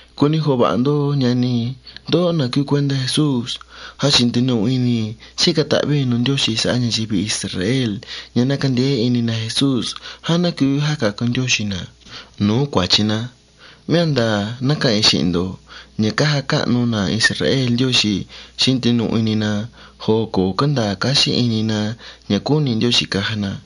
Cuni jo̱ho va̱ha ndó, ñani i̱, na̱ cúú cuéntá Jesús. Jáchi̱ ndinuhu ini i̱ xíca̱ ta̱hví i̱ nu̱ Ndióxi̱ sa̱há ña̱yivi Israel ña̱ ná candeé ini na Jesús já ná cuu jáca̱cu Ndióxi̱ na̱ nu̱ú cua̱chi na. Mé a̱ nda̱a̱ ná ca̱ha̱n i̱ xi̱hi̱n ndo̱ ña̱ cája cáhnu na̱ Israel Ndióxi̱ xi̱hín ndinuhu ini na joo co̱ cánda̱a̱ cáxí ini na ña̱ cúni̱ Ndióxi̱ caja na.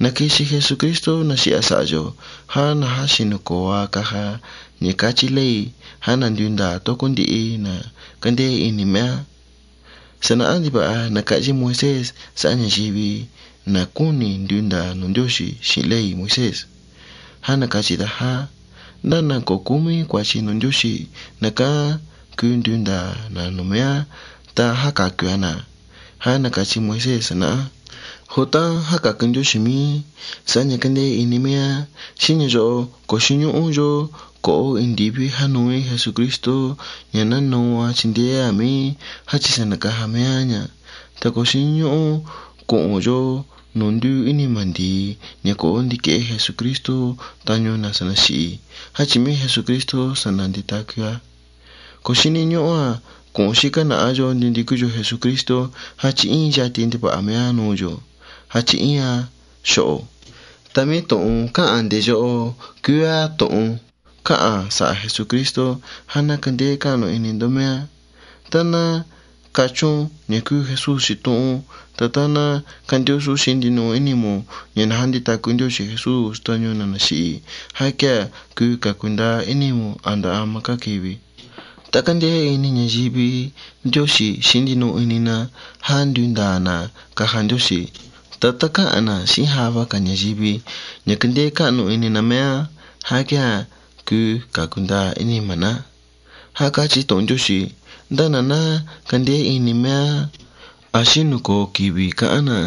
Co̱ xíni̱ na̱ ña̱ na̱quixi Jesucristo ta na̱xi̱hi̱ a̱ sa̱ha̱ yo̱ já na̱jáxi̱nu̱ co̱o a caja ña̱ cáchí ley ña̱ ná nduu nda̱a̱ tócó ndihi na̱ cándeé ini mé á. Sa̱nahá ndiva̱ha na̱ca̱hyí Moisés sa̱há ña̱yivi, na̱ cúni̱ nduu nda̱a̱ nu̱ Ndióxi̱ xi̱hi̱n ley Moisés. Já cáchí a̱ já: “Ndá na̱ co̱ cómí cua̱chi nu̱ Ndióxi̱, na̱ cán cuu nduu nda̱a̱ nu̱ mé á ta jáca̱cu a na̱”, já na̱ca̱hyí da̱. Joo tá ná jáca̱cu Ndióxi̱ mí sa̱há ña̱ cándeé iní mé á já quéa̱ co̱ xíní ñúhú cu̱hu̱n yo̱ indiví jánuu í Jesucristo ña̱ ná nuu a chindeé a̱ mí jáchi̱ sa̱ na̱caja mé á ña̱. Ta co̱ xíní ñúhú cu̱hu̱n yo̱ nu̱ ndúu ínima̱ ndi̱i ña̱ ná ndiquehé Jesucristo tañu na̱ sa̱ na̱xi̱hi̱ jáchi̱ mé Jesucristo sa̱ na̱nditacu tucu a. Co̱ xíní ñúhú cu̱hu̱n xícá na̱há yo̱ ndinducú yo̱ Jesucristo jáchi̱ íin yati ndiva̱ha mé á nu̱ yo̱ jáchi̱ íin a xo̱ho̱. Ta mé tu̱hun cáha̱n nde̱ yóho cúú á tu̱hun cáha̱n sa̱ha̱ Jesucristo já ná candeé ini ndó mé á. Ta tá cachún ña̱ cúú Jesús xitohún ta tá cándúsún xi̱hín ndinuhu ínimu̱n ña̱ na̱jánditacu Ndióxi̱ Jesús tañu na̱ na̱xi̱hi̱ já quéa̱ cuu ca̱cu ndaa ínimu̱n. Jáchi̱ tá cándeé ini ña̱yivi Ndióxi̱ xi̱hín ndinuhu ini na já nduu nda̱a̱ na̱ caja Ndióxi̱. Ta tá cáha̱n na̱ xi̱hín java ga̱ ña̱yivi ña̱ cándeé ini na mé á já quéa̱ cuu ca̱cu ndaa ínima̱ ná. Já cáchí tu̱hun Ndióxi̱ já: “Ndá na̱ ná candeé ini Jesús a̱ xínu̱ toho qui̱vi̱ ca̱hán na̱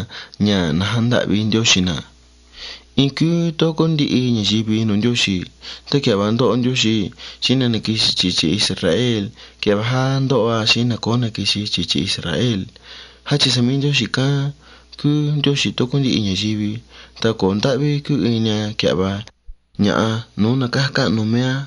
ña̱ na̱jándahvi Ndióxi̱ na̱.” In cúú tócó ndihi ña̱yivi nu̱ Ndióxi̱. Tá quia̱hva jáca̱cu Ndióxi̱ na̱ na̱quixi chi̱chí Israel quia̱hva já jáca̱cu a na̱ co̱ó na̱quixi chi̱chí Israel. Jáchi̱ sa̱ mé Ndióxi̱ cán cúú Ndióxi̱ nu̱ tócó ndihi ña̱yivi ta co̱ ndáhví cúu ini a quia̱hva ña̱ha nu̱ú na̱ xíca̱ ta̱hví nu̱ mé á.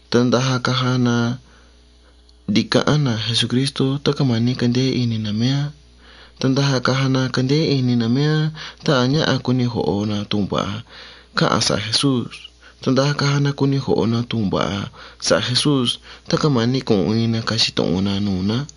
Ta ndaja caja na ca̱ca̱ ta̱hví na̱ nu̱ Jesús tá ta̱ cáma̱ni̱ candeé ini na mé á. Ta ndaja caja na candeé ini na mé á tá a̱ ñáha cuni jo̱ho na tu̱hun va̱ha cáha̱n sa̱ha̱ Jesús. Ta ndaja caja na cuni jo̱ho na̱ tu̱hun va̱ha sa̱ha̱ Jesús tá cáma̱ni̱ cu̱hu̱n in na ca̱xi tu̱hun na ña̱ nu̱ ná.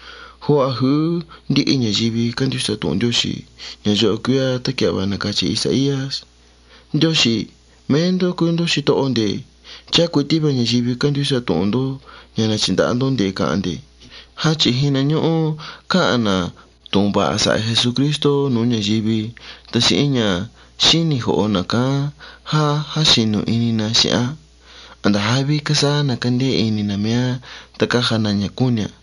Joo a̱ ju̱ú ndihi ña̱yivi cándúsa tu̱hun Ndióxi̱. Ña̱ yóho cúú á tá quia̱hva na̱cachi Isaías: “Ndióxi̱, mé ndó cúú ndó xitoho nde̱. Chá cuití ña̱yivi cándúsa tu̱hun na̱ca̱ha̱n nde̱ xi̱hi̱n ná.” Jáchi̱ jihna ñúhú cáha̱n na̱ tu̱hun va̱ha sa̱ha̱ Jesucristo nu̱ú ña̱yivi ta xi̱hín ña̱ xíni̱ jo̱ho na̱ cán jáxi̱nu̱ ini na xi̱hi̱n á. A̱nda̱ jáví cásáhá na̱ cándeé ini na mé á ta cája na ña̱ cúni̱ a̱.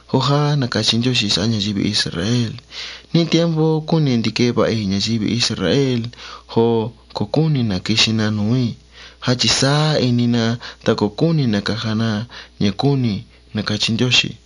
Joo já na̱cachi Ndióxi̱ sa̱há ña̱yivi Israel: “Níí tiempo cúni̱ ndiquehe va̱ha i̱ ña̱yivi Israel joo co̱ cúni̱ na̱ quixi na nu̱ú i̱ jáchi̱ sáá ini na ta co̱ cúni̱ na̱ caja na ña̱ cúni̱”, na̱cachi tu̱hun Ndióxi̱.